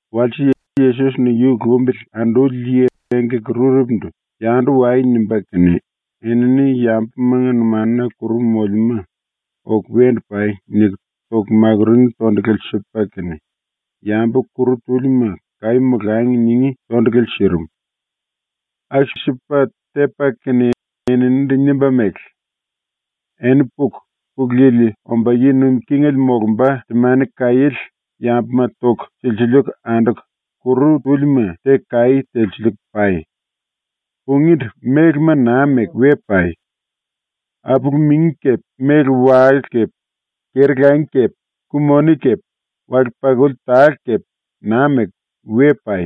Walse Yesos-ni yu lumbili anduli yi engkaki-rurepundu “Yandu wai.” nimba kene, enini yambumanga numanuna kuru molemúma “Oku wendu pai.” niku toku makurungí tondulale sipa kene, yambu kuru túlima ‘Kaí molangi.’ ningí tondulale sirim. Aku-sipa tepa kene eninindu nimba mele: “Eni puku, Pulu Yili omba yi nuim kingele molumba temani-kaiéle yambuma toku silsiliiku anduku, kuru túlima teku kaí telsiliiku pai. “Pungíndu, mélema naa meku we pai. Apulu-mingi kepe, méle-wale kepe, keri-langi kepe, ku-moni kepe, wale-pakuli tale kepe naa meku we pai.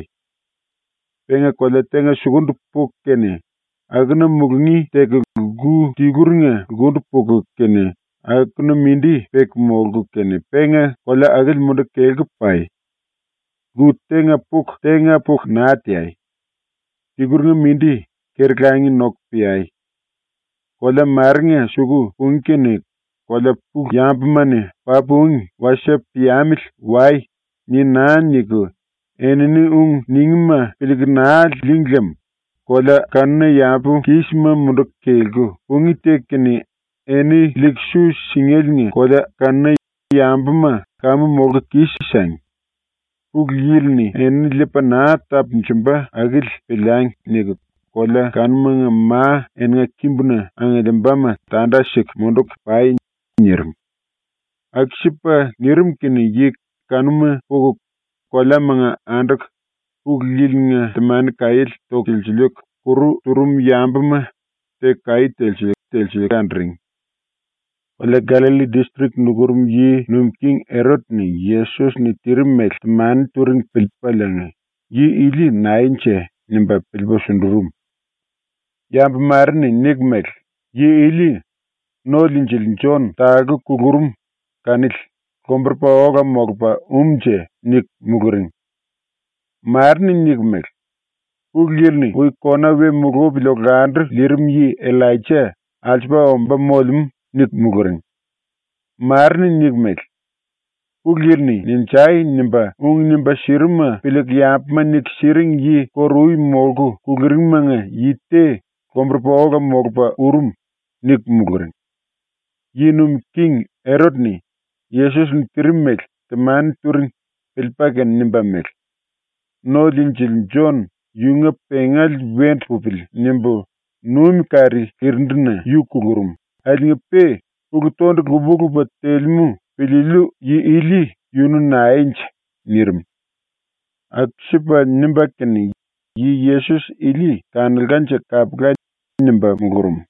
“Penga kolea tenga sukundu puku kene akuna mulungí teku lku tiluringa lkundu puku kene akuna mindi peku molku kene penga kolea akili munduku kelku pai. ⸤Lku tenga puku tenga puku naa teai. Tiluringa mindi keri-langi noku peai.⸥ Kolea marenga suku pungí kene kolea pulu yambuma-ni “Papu úngi. Wasie piamili wai.” ni naa niku enini ung ningíma piliiku naa lííngi lem kolea kanuna yambu kísima munduku kelku pungí teku kene eni liiku su singéliinga kolea kanuna yambuma ‘Kamu molku kis-sangi! Pulu Yili-ni enini liipa naa tapunjumba akili piliangi.’ niku kolea kanumanga ma eninga kimbuna angiliimbama tanda siku munduku pai.” nirim. Aku-sipa nirim kene yi kanuma puku, koleamanga anduku, Pulu Yili-nga temani-kaiéle toku silsiliiku, kuru turum yambuma teku kaí telsiliiku, telsiliiku anduring. Kolea Gallalli distrik nukurum yi nuim king Erot-ni Yesos-ni tirim mele temani turing piliipaliinga, ‘Yi ili naenje?’ nimba piliipa sundurum. Yambu mare-ni niku mele: “Yi ili ⸤No-Liinjili⸥ Jon ⸤talku kulurum kanili⸥ lomburupa ola molupa um-nje.” niku muluring. Mare-ni niku mele: “⸤Pulu Yili-ni ui kona we mulupili olandu liirim yi⸥ Illaija alsupa omba molemú.” niku muluring. Mare-ni niku mele: “Pulu Yili-ni “Ninjai!” nimba ung nimba sirimuma piliiku yambuma niku siring yi kóru-ui molku kuluringmanga yi te lomburupa ola molupa urum.” niku muluring. ⸤Yi nuim king⸥ Erot-ni ⸤Yesos-ni tirim mele temani turing⸥ piliipa kene nimba mele: “⸤No-Liinjili⸥ Jon ‘yunga pengale wendu pupili.’ nimbu numi kari lirindu-na yu kulurum akiliinga-pe ulu-tondulu lupa-lupa telemú piliiliu yi ili yunu naenje?” nirim. Aku-sipa nimba kene “Yi Yesos ili kanulkanje kapula!” nimba mulurum.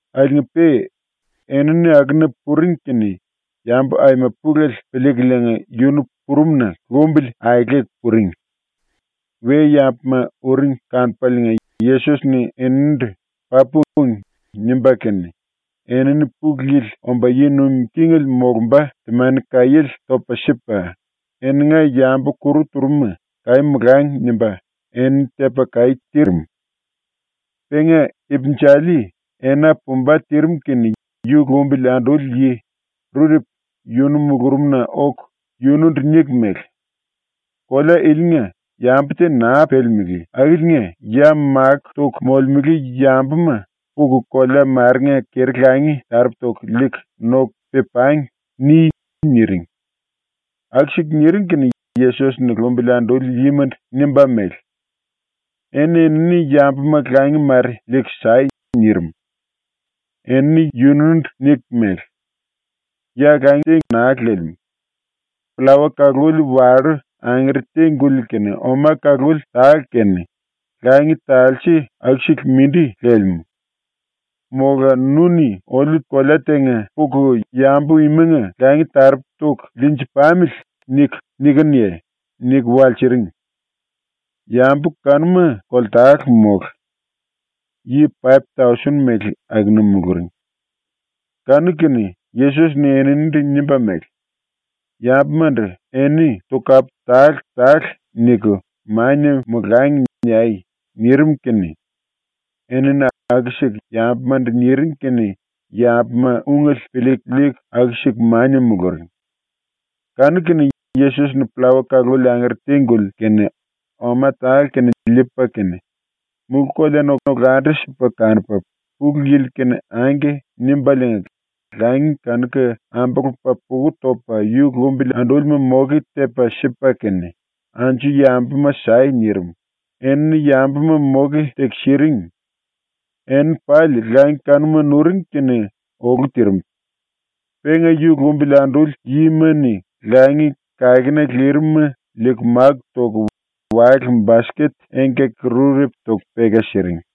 Akiliinga-pe enini akuna puring kene yambu aima pulele piliikuliinga yunu purumna lumbili aeleku puring. We-yambuma uring kanupaliinga Yesos-ni eninindu “Papu úngi.” nimba kene enini Pulu Yili omba yi nuim kingele molumba temani-kaiéle topa sipa, eninga yambu kuru turum-ma ‘Kaí molangi.’ nimba enini tepa kaí tirim. Penga ipinjali ena pumba tirim kene yu lumbili anduli yi rurepu yunu mulurumna oku yunundu niku mele: “Kolea ilinga yambu te naa pelemelé akiliinga ya máku toku molemele yambuma ‘Puku kolea marenga keri-langi taropu toku liiku noku pe-pangi.’ ni.” niring. Aku-siku niring kene Yesos-ni lumbili anduli yimandu nimba mele: “Eni-enini yambuma langi mare liiku sai.” nirim. Enini yunundu niku mele: “Ya langi mare au-sipa naa lelemú. Pllawa kaluli wallú angere te-guli kene oma kaluli tale kene, langi talse aku-sele mindi lelemú. Mola nu-ni ‘Oliu kolea tenga puku yambu imanga langi taropu toku liinji-pamili.’ niku nikinuye?” niku walsiring. (Yambu kanuma koltale mólu, yi paip-tausen mele akuna muluring.) Kanu-kene Yesos-ni eninindu nimba mele: “Yambumandu ‘eni tokapu tale-tale niku mania molangi.’ niai.” nirim kene enini aku-siku yambumandu niring kene yambuma ungele piliiku liiku aku-siku mania muluring. Kanu-kene Yesos-ni pllawa kaluli angere te-guli kene oma tale kene liipa kene mulú-koleana olandu-sipa kanupa ⸤Pulu Yili-kene⸥ “Angke” nimbaliinga langi kanuka ambulupa puku topa yu lumbili andúlima moke tepa sipa kene “Anju yambuma sai.” nirim, ⸤enini yambuma moke teku siring⸥. Enini pali langi kanuma nuring kene olu tirim. Penga yu lumbili anduli yima-ni langi kakena lirim-ma liiku máku toku wale-basket engkaki-rurepu toku peka siring.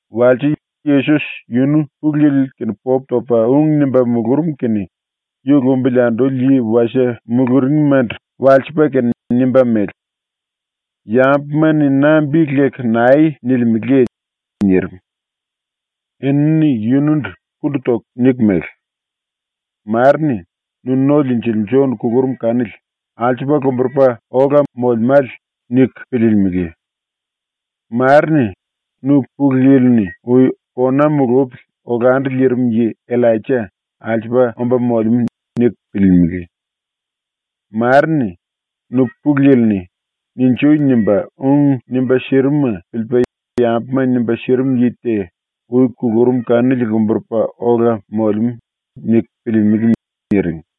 Walse, Yesos yunu Pulu Yili-kene popu topa ung nimba mulurum kene yu lumbili anduli yi wasie muluringmandu walsipa kene nimba mele: “Yambuma-ni na bi leku nae nilimeleye?” nirim. Enini yunundu pundu toku niku mele: “Mare-ni “Nu No-Liinjili Jon ⸤kulurum kanili alsupa lomburupa ola molemále⸥.” niku piliilimili; mare-ni “Nu ⸤Pulu Yili-ni ui kona mulupili olandu liirim yi⸥ Illaija alsupa omba molemú.” niku piliilimili; mare-ni “Nu Pulu Yili-ni “Ninjui!” nimba ung nimba sirimuma piliipa yambuma nimba sirim yi te ui kulurum kanili lomburupa ola molemú.” niku piliilimili.” niring.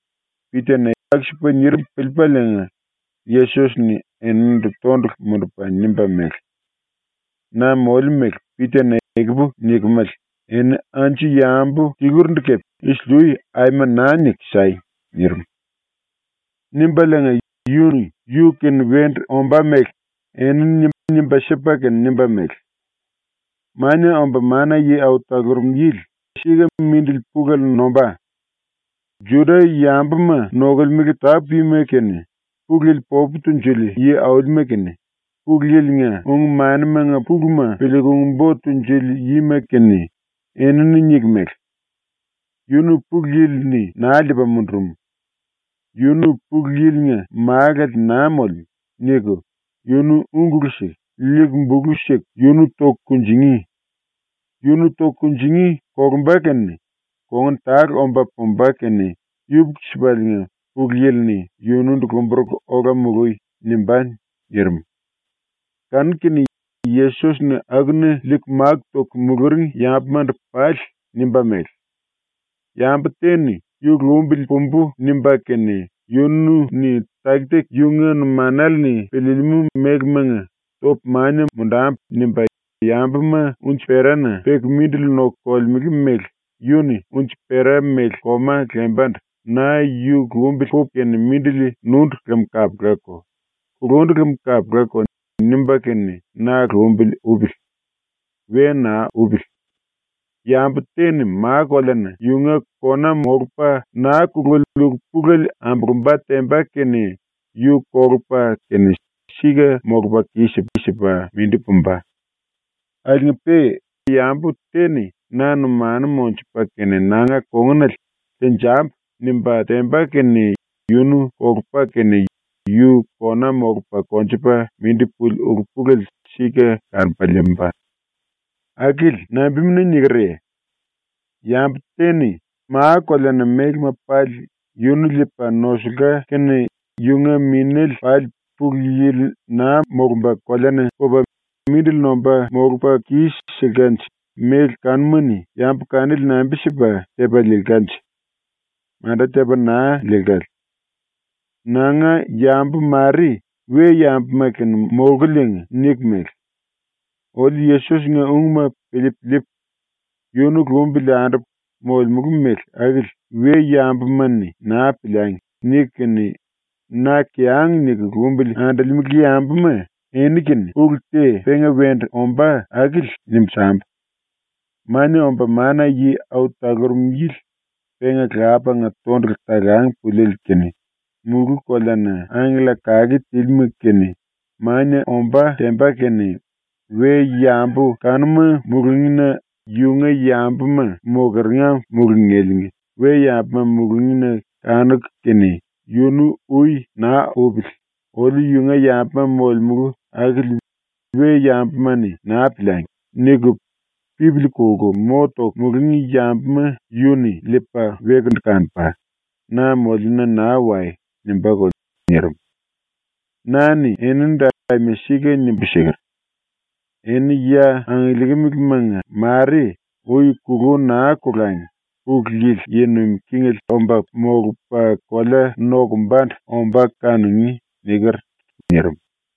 Pita-ni aku-sipa nirim piliipaliinga Yesos-ni eninindu tondulu mundupa nimba mele: “Na moliu mele ⸤Pita-ni ekupu nikemele⸥ eni anju yambu tilurindu kepe ⸤isili-ui⸥ aima naa niku sai!” nirim. ⸤Nimbaliinga⸥ yu-ni ⸤yu-kene wendu ombá mele⸥ enini nimba sipa kene nimba mele: “Mania Omba Mana-Yi Au Talurum Yili sika mindili pulele nombá. Juda-yambuma nokolemele tápu-yima kene, Pulu Yili popu tunjuli yi-aulima kene, Pulu Yili-nga ung-manimanga puluma piliiku ung-bo tunjuli yima kene, enini ⸤niku mele: “Yunu Pulu Yili-ni naa liipa mundurum. Yunu Pulu Yili-nga Málale naa molemú.” niku⸥ yunu úngulu siku, liiku bulu siku yunu toku kunjingí. Yunu toku kunjingí kolumba kene kongun tale omba pumba kene yupuku-sipaliinga Pulu Yili-ni yunundu ‘Lomburuku ola mului.’ nimbá.” nirim. Kanu-kene Yesos-ni akuna liiku máku toku muluring yambumandu pali nimba mele: “Yambu te-ni ‘Yu lumbili pumbú.’ nimba kene yunu-ni taki-taki yunga numanale-ni piliilimú melemanga ‘Topu mania mundambu.’ nimba, yambuma unji-perana peku mindili noku kolemele mele yu-ni unji-pera mele koma lembandu ‘Na yu lumbili pupu kene mindili nundu lem kapulako; kulundu lem kapulako.’ nimba kene na lumbili upili. We naa upili. Yambu te-ni ma-koleana yunga kona molupa naa kululi ulu-pulele ambulumba temba kene yu kolupa kene sika molupa kis-sipa mindi pumba. Akiliinga-pe yambu te-ni na numanu monjupa kene nanga kongunale “Tenjambu.” nimba temba kene yunu kolupa kene yu kona molupa konjupa mindi puli ulu-pulele sika kanupa liimba. ⸤Akili nambimuna nikerye?⸥ Yambu te-ni ma-koleana mélema pali yunu liipa nosulka kene yunga minéle pali Pulu Yili naa molumba koleana pupa mindili nomba molupa kis-silkanje méle kanuma-ni yambu kanili nambi-sipa tepa liilkanje? Manda tepa naa liilkale. “Nanga yambu mare we-yambuma kene molkuliinga niku mele: “Oliu Yesos-nga ungma piliipu liipu, yunu lumbili andupu molemulu mele akili we-yambuma-ni naa piliangi.” niku kene, na kiyang niku lumbili andolemele yambuma eni-kene ulu te penga wendu ombá akili nimbu sambu: Mania Omba Mana-Yi Au Talurum Yili penga Lapanga tondulu talang puliele kene ⸤mulú-koleana⸥ angkella kake tílima kene ⸤mania⸥ ombá temba kene, we-yambu kanuma mulungína yunga yambuma mokeringa mulungéliinga we-yambuma mulungína kanuku kene yunu ui naa upili ‘Oliu yunga yambuma molemulu akili we-yambuma-ni naa piliangi.’ niku pipili kolku mo toku mulungí yambuma yu-ni liipa wekundu kanupa, “Na moliuna naa wai.” nimbáko.” ⸤nirim.⸥ “Na-ni enindu aima sika nimbu siker: “Eni ya angiliikimilimanga mare ui kulú naa kolangi Pulu Yili yi nuim kingele omba molupa kolea nokumbandu ombá kanungí.” niker.” nirim.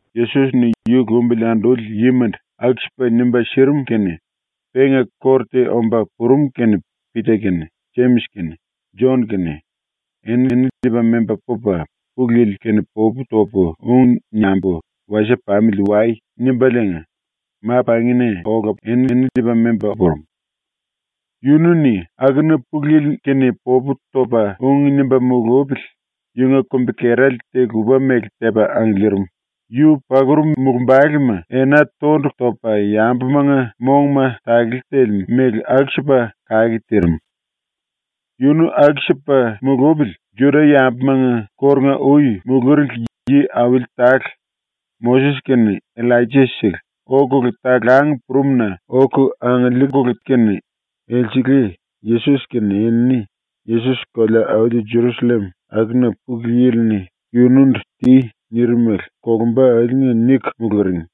Yesos-ni ⸤yu lumbili anduli yimandu aku-sipa nimba sirim kene⸥ penga kóru te omba purum kene Pita kene, Jemis kene, Jon kene, enini liipa memba pupa “Pulu Yili-kene popu topu ung niambu wasie pamili wai.” nimbaliinga ma-pangina enini liipa memba ola purum. Yunu-ni akuna Pulu Yili-kene popu topa ung nimba mulupili yunga kumbi-kerale te-lupa-mele tepa angiliirim, yu pakurum mulumbalema ena tondulu topa yambumanga mongma takele telemú mele aku-sipa kake tirim. Yunu aku-sipa mulupili, ⸤Juda-yambumanga kórunga-ui muluringli yi-auli tale,⸥ Moses kene Illaija-sele, okulu talang purum-na oku angiliirim elsele Yesos kene enini Yesos kolea-auli Jerusallem akuna Pulu Yili-ni yunundu ‘Ti.’ nirim mele kolumba akili niku muluring.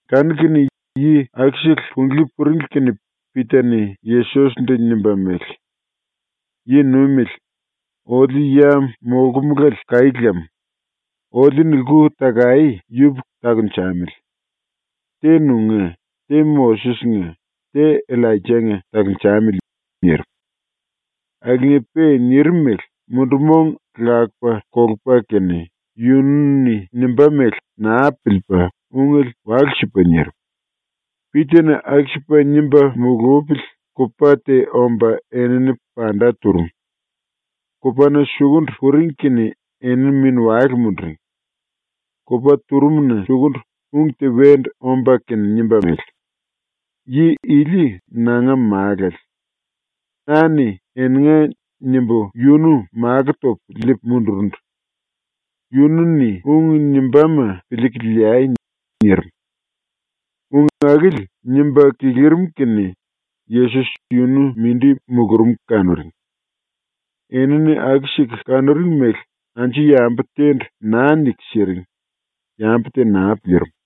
Kanu-kene yi akusele punglí puringli kene Pita-ni Yesos-ndu nimba mele: “Yi Nuimele, oliu ya molkumulale kaí lam. Oliu-ni lku-takaé yupuku takunjamili. Te nunga, te Moses-nga, te Illaija-nga takunjamili.” nirim. (Akiliinga-pe nirim mele ⸤mundu-mong lakupa kolupa kene⸥ yunu-ni nimbá mele naa piliipa ungele walu-sipa nirim.) Pita-ni aku-sipa nimba mulupili kupa te omba enini panda turum. Kupana sukundu puring kene enini mini-wale munduring. Kupa turumuna sukundu ung te wendu omba kene nimba mele: “Yi ili nanga Málale. Na-ni ⸤‘Eninga’ nimbu⸥ yunu makó topu liipu mundurundu. Yunu-ni ung nimbáma piliiku liai.” nirim. Ung akili nimba kilirim kene Yesos yunu mindi mulurum kanuring. Enini aku-siku kanuring mele anju yambu te-ndu naa niku siring, yambu te naa piliirim.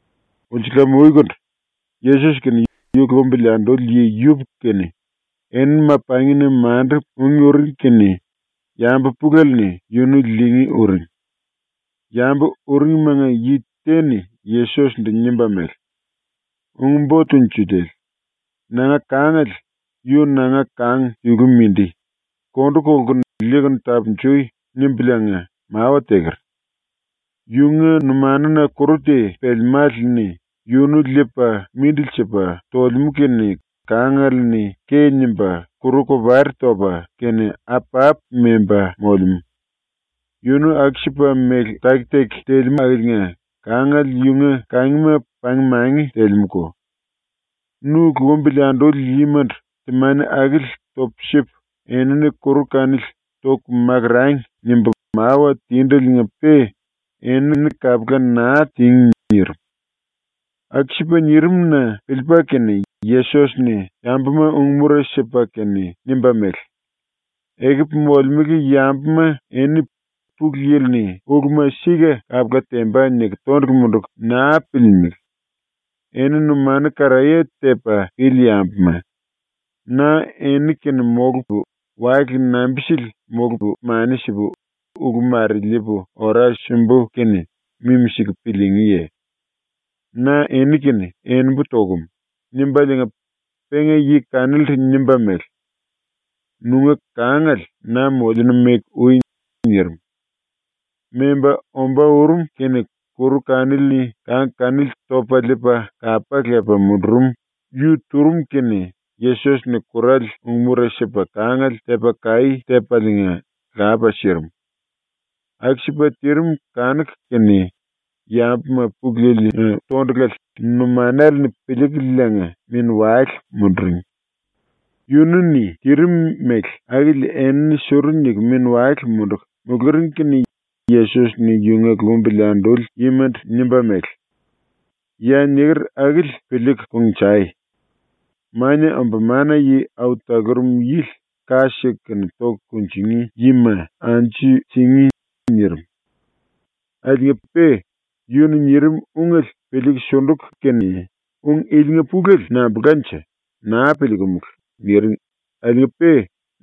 Ulsulam-uikundu, ⸤Yesos kene yu lumbili anduli yi yupuku kene⸥ enini ma-pangina mandu ungí uring kene yambu pulele-ni yunu liingí uring. Yambu uringimanga yi te-ni Yesos-ndu nimba mele: “Ung-Bo Tunjuliele, ‘Nanga kangale, yu nanga kang tiluele mindi, kondu kolkunu liikunu tapunjui.’ nimbuliinga mawa teker. Yunga numanuna kuru te pelemále-ni yunu liipa mindili sipa tolemú kene kangale-ni ke nimba, kuru-kopari topa kene apapu memba molemú. Yunu aku-sipa mele taki-taki telemú akiliinga kangale yunga kangima pang-mangi telemúko. Nu lumbili anduli yimandu temani akili topu sipu enini kuru kanili ‘Toku makurangi.’ nimbu mawa tindeliinga-pe enini kapula naa tíngi.” nirim. ⸤Aku-sipa nirim-na⸥ piliipa kene Yesos-ni ⸤yambuma ung-mura sipa kene⸥ nimba mele: “Ekupu molemele yambuma eni ⸤‘Pulu Yili-ni uluma sika kapula temba.’ niku⸥ tondulu munduku naa piliilimili. Eni numanu karaye tepa pili yambuma, na eni-kene molupu, wale nambi-sili molupu mani sipu ulu mare liipu ora simbu kene mimi-siku piliingíye? ⸤Na eni-kene enembu tokum.⸥” nimbaliinga penga yi kanilindu nimba mele: “Nunga kangale na moliuna meku ui.” nirim. Memba ombá urum kene kuru kanili-ni kang kanili topa liipa kapá lepa mundurum yu turum kene Yesos-ni kurale ung-mura sipa kangale tepa kaí tepaliinga lapa sirim. Aku-sipa tirim kanuku kene yambuma Pulu Yili-nga tondulale numanale-ni piliikuliinga mini-wale munduring. Yunu-ni tirim mele akili enini suru niku mini-wale munduku muluring kene Yesos-ni yunga lumbili anduli yimandu nimba mele: “Ya niker akili piliiku kongnjai. Mania Omba Mana-Yi Au Talurum Yili ⸤ka siku kene toku kunjingí⸥ yima anju singí.” nirim. Akiliinga-pe yunu-ni nirim ungele piliiku sunduku kene ‘Ung ilinga pulele nambulkanje, naa piliikumulu.’ niring akiliinga-pe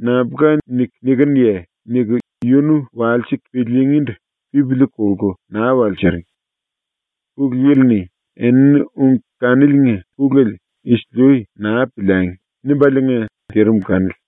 “Nambulka niku nikinuye?” niku yunu walsiku piliingíndu pipili kolku naa walsiring. Pulu Yili-ni ‘Enini ung kaniliinga pulele isili-ui naa piliangi.’ nimbaliinga tirim kanili.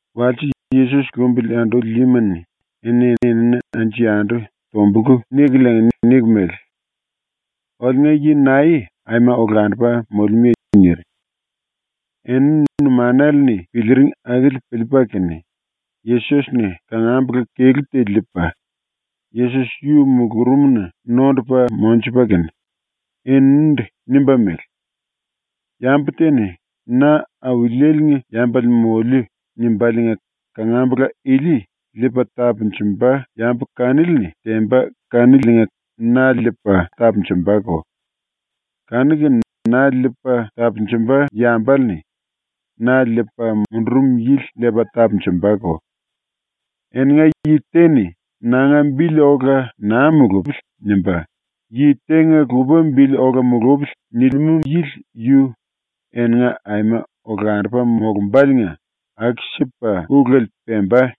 ⸤Walse Yesos lumbili anduli yima-ni⸥ eni-enini anju-yandu tombulku nikuliinga niku mele: “Oliunga yi nae aima olandupa molemúye?” niring. Enini numanale-ni piliiring akili piliipa kene, Yesos-ni kangambula kelú te liipa ⸤Yesos-yu⸥ mulurumna nondupa monjupa kene eninindu nimba mele: “Yambu te-ni ‘Na Auliele-nga yambale moliu.’ nimbaliinga kangambula ili liipa tapunjumba yambu kanili-ni temba kaniliinga na liipa tapunjumbako. Kanu-kene na liipa tapunjumba yambale-ni na liipa mundurum yili liipa tapunjumbako. Eninga yi te-ni ‘Nanga bili ola naa mulupili.’ nimba, ‘Yi tenga lupa bili ola mulupili.’ nilimú yili yu eninga aima olandupa molumbáliinga ⸤aku-sipa ulele pemba⸥.”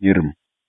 nirim.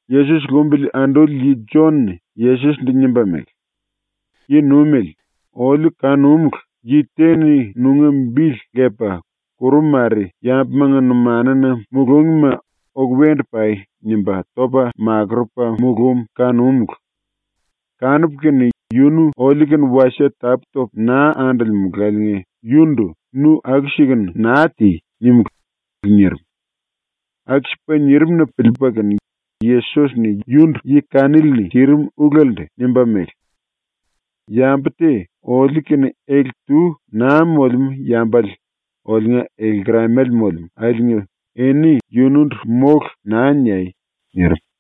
Yesos lumbili anduli yi Jon-ni Yesos-ndu nimba mele: “Yi-Nuimele, oliu kanúmulu, yi te-ni nunga bili lepa kuru mare yambumanga numanuna mulúngima “Oku wendu pai.” nimba topa makurupa mulúm kanúmulu. Kanupu kene yunu oliu-kene wasie tapú-topu naa andolemulaliinga yundu “Nu aku-sikunu naa ti.” nímulu.” nirim. Aku-sipa nirim-na piliipa kene Yesos-ni yundu ⸤yi kanili-ni tirim ulelendu⸥ nimba mele: “Yambu te oliu-kene ele-tu naa molemú yambale oliunga ele-lkeramale molemú akiliinga eni yunundu “Mólu.” naa niai.” nirim.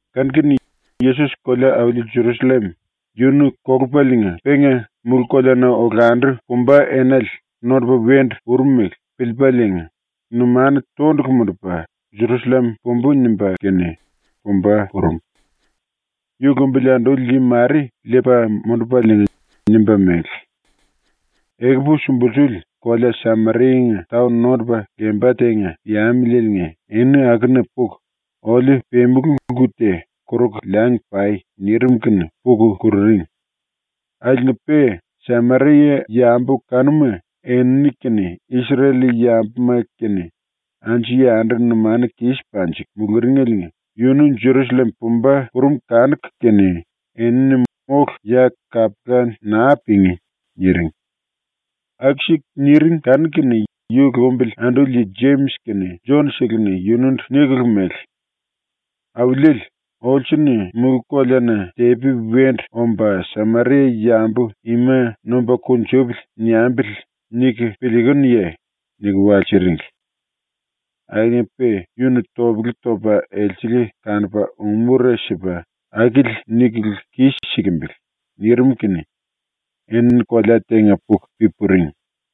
Kanu-kene Yesos kolea-auli Jerusallem yunu kolupaliinga penga mulú-koleana olandu pumba enale nondupa wendu urumele piliipaliinga numanu tondulu mundupa ‘Jerusallem pumbú.’ nimba kene pumba purum. Yu lumbili anduli yi mare liipa mundupaliinga nimba mele: “Ekupu sumbulsuli kolea Sameria-nga taon nondupa lemba tenga piamilieliinga eni akuna puku oliu pemulu lku te koruku liangi pai.” nirim kene puku kururing. Akiliinga-pe Sameria-yambu kanuma ⸤enini kene Isrel-yambuma kene anju-yandu numanu kis panjiku muluringeliinga⸥ yunu Jerusallem pumba purum kanuku kene enini “Mólu, ya kapula naa pingí.” niring. Aku-siku niring kanuku kene yu lumbili anduli yi Jemis kene Jon-seleni yunundu nikulu mele: “Auliele, ‘olsu-ni ‘Mulú-koleana tepi wendu omba Sameria-yambu ima nomba kunjupili.’ niambili.’ niku piliikunuye?” niku walsiringli. Akiliinga-pe yunu topele topa elsele kanupa ung-mura sipa “Akili nikulu kis-sikimbili.” nirim kene enini kolea tenga puku pi-puring.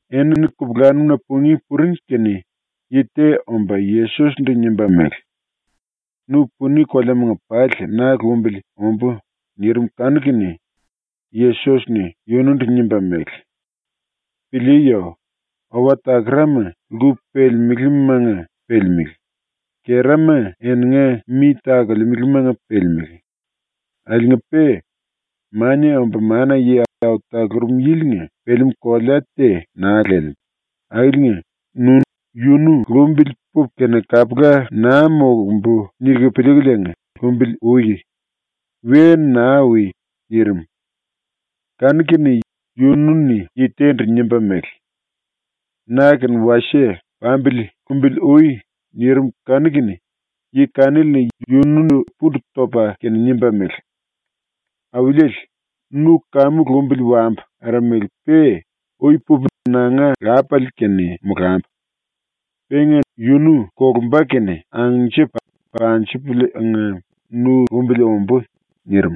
Enini kupulanum-na pungí puring kene yi te omba Yesos-ndu nimba mele: “Nu puni koleamanga pali na lumbili ombú.” nirim kanu-kene Yesos-ni yunundu nimba mele: “Piliiyo! Owa-takarama lku pelemelémanga pelemelé; kerama eninga mi takolemelemanga pelemelé; akiliinga-pe Mania Omba Mana-Yi Au Talurum Yili-nga pelemú kolea te naa lelemú ⸤akiliinga, nu ‘Yunu lumbili pupu kene kapula naa molumbu.’ niku piliikuliinga lumbili ui. We naa ui.⸥” nirim. Kanu-kene yunu-ni yi te-ndu nimba mele: “Na-kene wasie pambili lumbili ui.” nirim kanu-kene yi kanili-ni yunundu pundu topa kene nimba mele: “Auliele, ⸤nu kamu lumbili wambu aramele-pe⸥ ui pupu nanga lápale-kene molambu. Penga yunu kolumba kene angnjipu panjipuliinga nu lumbili ombú.” nirim.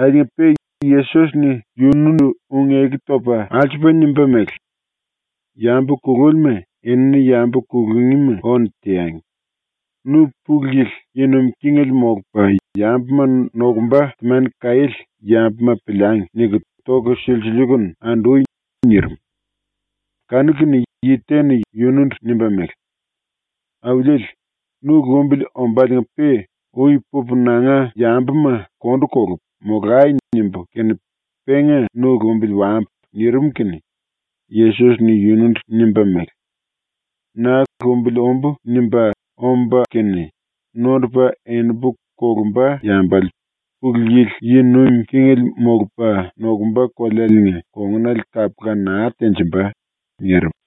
Akiliinga-pe Yesos-ni yunundu ⸤ung-eku topa⸥ alsupa nimba mele: “Yambu kulúlima enini yambu kulungíma ónu teangi. Nu ‘Pulu Yili yi nuim kingele molupa yambuma nokumba temani-kaiéle yambuma piliangi.’ niku toku silsiliikunu andui.” nirim. Kanu-kene yi te-ni yunundu nimba mele: “Auliele, nu lumbili ombáliinga-pe ui pupu nanga yambuma kondu kolupu ‘Molai.’ nimbu kene penga nu lumbili wambu.” nirim kene Yesos-ni yunundu nimba mele: “Na ‘Lumbili ombú.’ nimba omba kene nondupa enimbu kolumba yambale Pulu Yili yi nuim kingele molupa nokumba kolealiinga kongunale kapula naa tenjimba.” nirim.